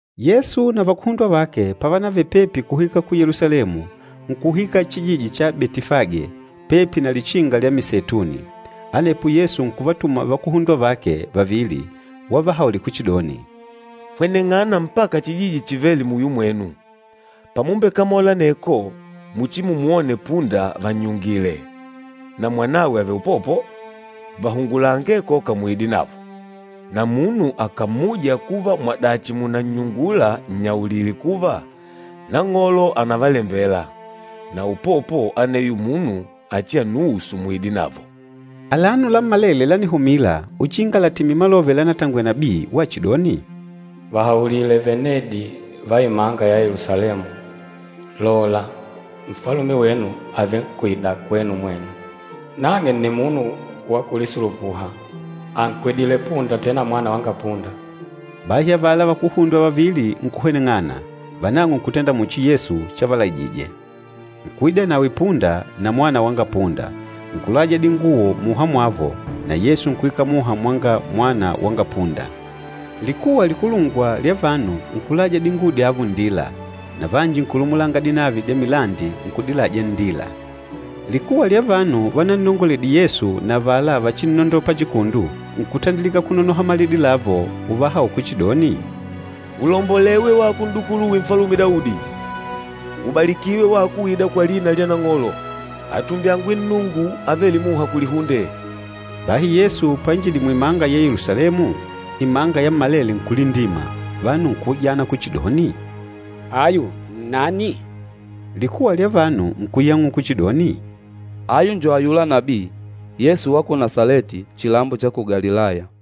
Yesu na vakuhundwa vake pavanavele pepi kuhwika ku Yelusalemu, nkuhwika chijiji cha Betifage, pepi na Lichinga lya Miseituni. Anepo Yesu nkuvatuma vakuhundwa vake vavili, wavahaulila kuchidoni, “Hweneng'ana mpaka chijiji chivêle muyo mwenu. Pamumbekamola aneko, muchimumwone punda vannyungile, na mwanawe àvele upopo. Vahungulange koka muide navo. Na munu akàmmuja kuva mwadachi mùnannyungula nnyaulile kuva, ‘Nang'olo ànavalembela,’ na upopo aneyo munu achiannuusu muide navo.” Alano lammalele lánihumila, uchinga latimile malove lánatangwele nabii wachidoni, “Vahaulile venedi va imanga ya Yelusalemu, ‘Lola, Nfalume wenu àvenkwida kwenu mwenu. Nang'e nni munu wa kulisulupuha, ànkwedile punda tena mwana wanga punda.’” Bahi avala vakuhundwa vavili nkuhweneng'ana, vanang'o nkutenda muchi Yesu chavalaijije. Nkuida nawe punda na mwana wanga punda, nkulaja dinguwo muha mwavo, na Yesu nkuikala muha mwanga mwana wanga punda. Likuwa likulungwa lya vanu nkulaja dinguwo dyavo nndila, na vanji nkulumulanga dinavi dya milandi nkudilaja nndila. Likuwa lya vanu vanannongoledile Yesu na avala vachinnondola pachikundu, nkutandilika kunonoha malidi lavo uvahaula kuchidoni, “Ulombolewe wako N'dukuluwe Nfalume Daudi! Ubalikiwe wako uîda kwa lina lya Nang'olo! Atumbyangwe Nnungu avêle muha kulihunde!” Bahi Yesu painjidile muimanga ya Yelusalemu, imanga yammalele nkulindima. Vanu nkuujana kuchidoni, “Ayu nnani?” Likuwa lya vanu nkuyang'ula kuchidoni, “Ayu njo ayula nabii, Yesu wa ku Nasaleti chilambo cha ku Galilaya.”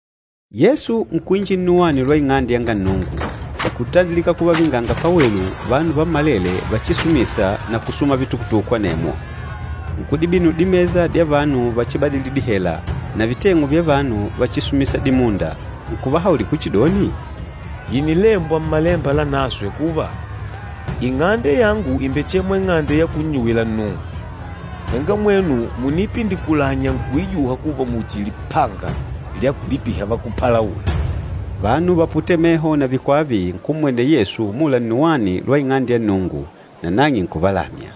Yesu nkuinjila nnuwani lwa Ing'ande yanga Nnungu, nkutandilika kuvavingangila pawelu vanu vammalele vachisumisa na kusuma vitukutuku, anemwo. Nkudibinula dimesa dya vanu vachibadili dihela, na viteng'u vya vanu váchisumìsà dimunda. Nkuvahaulila kuchidoni, “Ìnilembwa Mmalemba Lanaswe kuva, ‘Ing'ande yangu ìmbechemwa ing'ande ya kunnyuwila Nnungu.’ Henga mwenu mùniipindikulanya nkuijuha kuva muchi lipanga lya kulipiha vakúpalaula!” Vanu vaputêle meho na vikwava nkummwenela Yesu umula nnuwani lwa Ing'ande ya Nnungu, nanang'e nkuvalamya.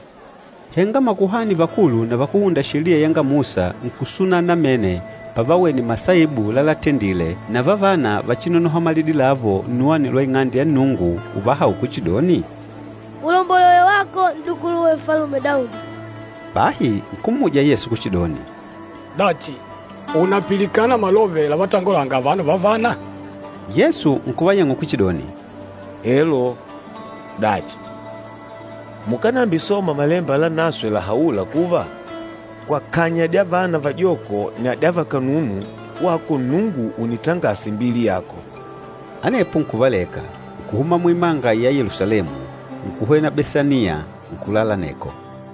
Henga makuhani vakulu na vakúhunda Sheliya yanga Musa nkusunala namene pavawene masaibu lalatendile na vavana vachinonoha malidi lavo nnuwani lwa Ing'ande ya Nnungu uvahaula kuchidoni, “Ulombolewe wako, N'dukuluwe Nfalume Daudi!” Bahi nkummuja Yesu kuchidoni, “Dachi, ùnapilikana malove lavatongolanga avano vavana?” Yesu nkuvayang'ula kuchidoni, “Elo. Dachi, mukánambisoma Malemba Lanaswe lahaûla kuva, ‘Kwa kanya dya vana vajoko na dya vakanunu wako Nnungu ùnitangasa imbili yako.’” Anepo nkuvaleka, nkuhuma muimanga ya Yelusalemu, nkuhwena Besaniya, nkulala aneko.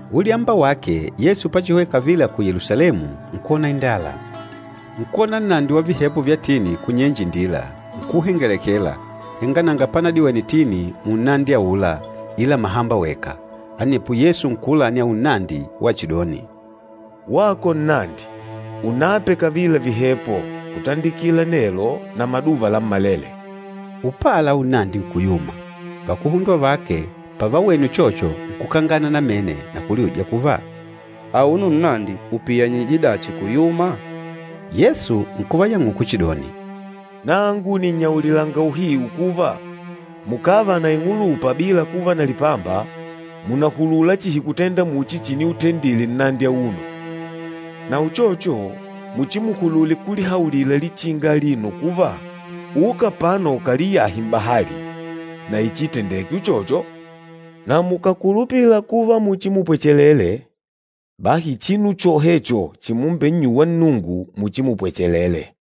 Ulyamba wake Yesu pachihwena kavila ku Yelusalemu, nkwona indala. Nkuwona nnandi wa vihepo vya tini kunyenje indila, nkuuhengelekela, henga nanga panadiwene tini munnandi aula ila mahamba weka. Anepo Yesu nkuulani aula nnandi wachidoni, “Wako nnandi, unape kavila vihepo, kutandikila nelo na maduva lammalele!” Upala aula nnandi nkuyuma. Vakuhundwa vake pavawene uchocho, nkukangana namene na kuliuja kuva, “Auno nnandi upiyanyije dachi kuyuma?” Yesu nkuvayang'ula kuchidoni, “Nangu nìnnyaulilanga uhiu kuva, mukàva na ing'ulupa bila kuva na lipamba, mùnahulula chihi kutenda muchi chiniutendedile nnandi auno, na uchocho muchimuhulule kulihaulila lichinga alino kuva, ‘Uka apano ukaliyahe m'bahali,’ na ichiitendeke uchocho. Na mukàkulupila kuva muchimupwechelele, bahi chinu chohecho chimumbennyuwa Nnungu muchimupwechelele.”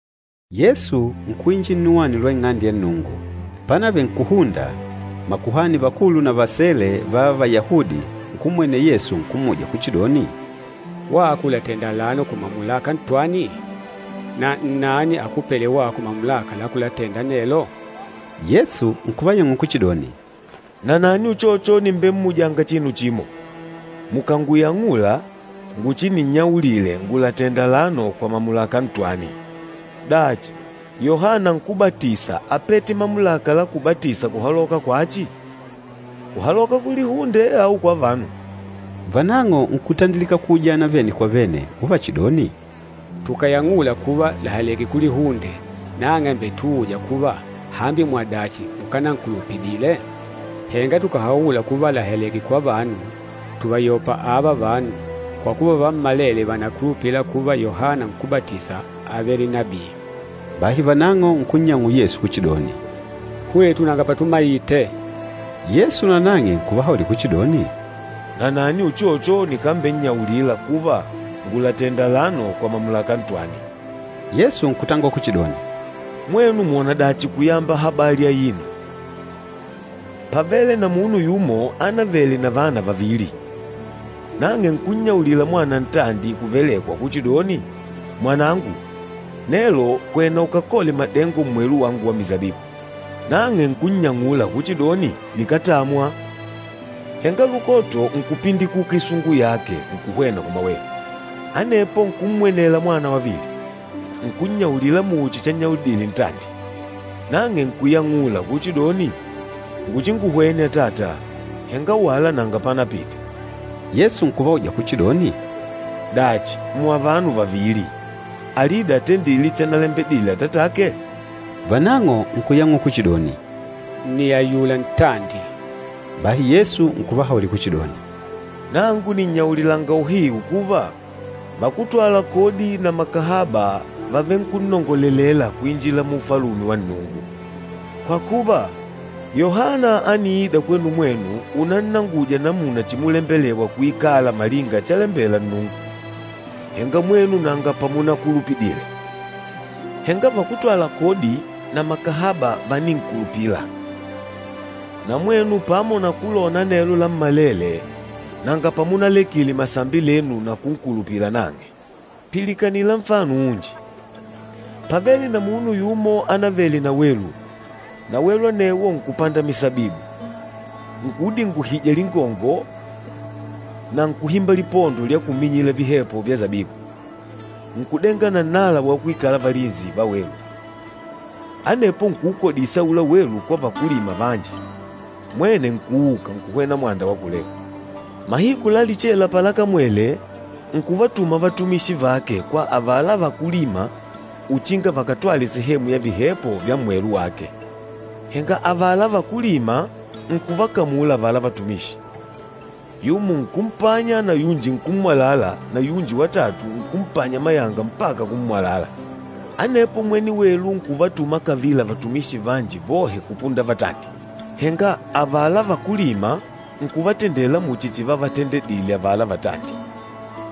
Yesu nkuinjila nnuwani lwa Ing'ande ya Nnungu. Pánavele nkùhunda, makuhani vakulu na vasele va Vayahudi nkummwenela Yesu nkummuja kuchidoni, “Wako ùlatenda alano kwa mamulaka ntwani? Na nnani akupêle wako mamulaka la kulatenda anelo?” Yesu nkuvayang'ula kuchidoni, “Nanani uchocho nìmbemmujanga chinu chimo. Mukànguyang'ula, nguchininnyaulile ngùlatenda alano kwa mamulaka ntwani. Dachi, Yohana Nkúbatisa ápete mamulaka la kubatisa kuhaloka kwachi? Kuhaloka kulihunde au kwa vanu?” Vanang'o nkutandilika kuujana vene kwa vene, uvachidoni, “Tukàyang'ula kuva làhaleke kulihunde, nang'e àmbetuuja kuva, ‘Hambi mwadachi mukánankulupidile?’ Henga tukàhaula kuva làhaleke kwa vanu, tùvayopa ava vanu, kwa kuva vammalele vànakulupila kuva Yohana Nkúbatisa ávele nabii.” Bahi vanang'o nkunnyang'ula Yesu kuchidoni, “Hwetu nanga patumaite!” Yesu nanang'e nkuvahaulila kuchidoni, “Nanani uchocho nikambennyaulila kuva, ngùlatenda alano kwa mamulaka ntwani.” Yesu nkutangola kuchidoni, “Mwenu mwònadachi kuyamba habali aino? Pávele na munu yumo ánavele na vana vavili. Nang'e nkunnyaulila mwana ntandi kuvelekwa kuchidoni, ‘Mwanangu, nelo hwena ukakole madengo mmwelu wangu wa misabibu.’ Nang'e nkunnyang'ula kuchidoni, ‘Nikátamwa.’ Henga lukoto nkupindikuka isungu yake nkuhwena kumawelu. Anepo nkummwenela mwana wavili, nkunnyaulila muchi channyaulidile ntandi. Nang'e nkuyang'ula kuchidoni, ‘Nguchinguhwene atata,’ henga wala nanga panapite.” Yesu nkuvauja kuchidoni, “Dachi, muavano vavili, alida atendîle chanalembedile atatake?” Vanang'o nkuyang'ula kuchidoni, “Nni ayula ntandi.” Bahi Yesu nkuvahaulila kuchidoni, “Nangu nìnnyaulilanga uhiu kuva, vakútwala kodi na makahaba vàvenkunnongolelela kuinjila mu Ufalume wa Nnungu. Kwa kuva, Yohana ániida kwenu mwenu unannanguja namuna chimulembelewa kuikalanga malinga chalembela Nnungu, henga mwenu nanga pamunankulupidile. Henga vakútwala kodi na makahaba váninkulupila. Na mwenu pamo na kulona anelo lammalele, nanga pamunalekile masambi lenu na kunkulupila nang'e.” “Pilikanila nfano unji. Pávele na munu yumo ánavele na welu, na welu anewo nkùpanda misabibu, nkuudinguhija lingongo na nkùhimba lipondo lya kuminyila vihepo vya sabibu, nkùdenga na nnala wa kuikala valinsi va welu. Anepo nkuukodisa aula welu kwa vakúlima vanji, mwene nkuuka nkuhwena mwanda wa kulehu. Mahiku la lichela palakamwele, nkuvatuma vatumishi vake kwa avala vakúlima uchinga vakatwale sehemu ya vihepo vya mmwelu wake. Henga avala vakúlima nkuvakamula avala vatumishi. Yumo nkumpanya na yunji nkummwalala na yunji watatu nkumpanya mayanga mpaka kummwalala. Anepo mwene welu nkuvatuma kavila vatumishi vanji vohe kupunda vatandi, henga avala vakúlima nkuvatendela muchi chivavatendeledile avala vatandi.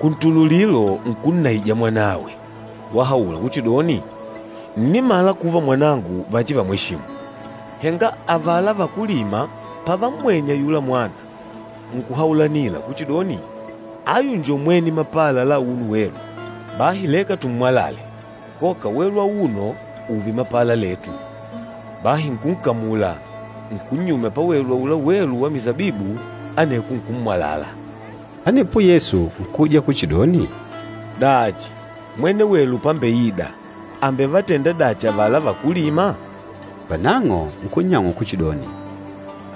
Kuntululilo, nkunnaija mwanawe, wahaula kuchidoni, ‘Ǹnimala kuva mwanangu vachivamweshimu.’ Henga avala vakúlima pavammwene ayula mwana, nkuhaulanila kuchidoni, ‘Ayu njo mwene mapala la auno welu. Bahi leka tummwalale, koka welu auno ùùve mapala letu!’ Bahi nkunkamula, nkunnyumya pawelu aula welu wa misabibu, aneko nkummwalala.” Anepo Yesu nkuuja kuchidoni, “Dachi, mwene welu pámbeìdà, àmbevatenda dachi avala vakúlima?” Vanang'o nkunnyang'ula kuchidoni,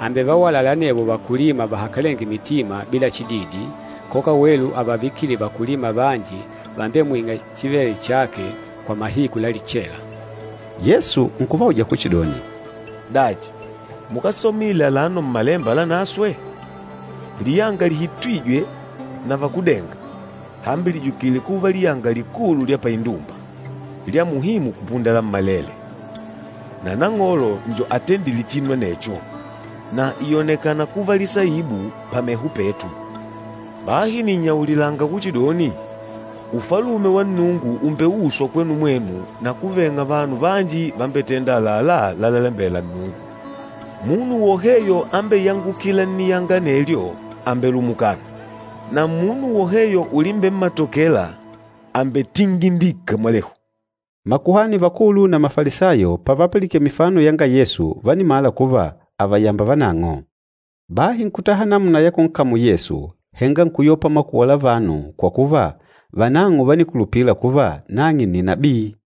“Àmbevawalala anevo vakúlima vahakalenge mitima bila chididi, koka welu àvavikile vakúlima vanji vambemwîng'a chivêle chake kwa mahiku la lichela.” Yesu nkuvauja kuchidoni, “Dachi, mukásomile alano Mmalemba Lanaswe? ‘Liyanga lihitwîje na vakúdenga, hambi lìjukile kuva liyanga likulu lya paindumba, lya muhimu kupunda lammalele. Na Nang'olo njo atendîle chinu anecho, na ìyonekana kuva lisaibu pameho petu.’ Bahi nìnnyaulilanga kuchidoni, Ufalume wa Nnungu ùmbeuswa kwenu mwenu na kuveng'a vanu vanji vambetênda àlalá lalalembela Nnungu. Munu woheyo ambeyangukîla nniyanga anelyo àmbelumukana, na munu woheyo ulimbemmatokela, àmbetingindika mwalehu.” Makuhani vakulu na Mafalisayo pavapilikene mifano yanga Yesu, vánimala kuva àvayamba vanang'o. Bahi nkutaha namuna ya kunkamula Yesu, henga nkuyopa makuwa la vanu kwa kuva, vanang'o vánikulupila kuva nang'e nni nabii.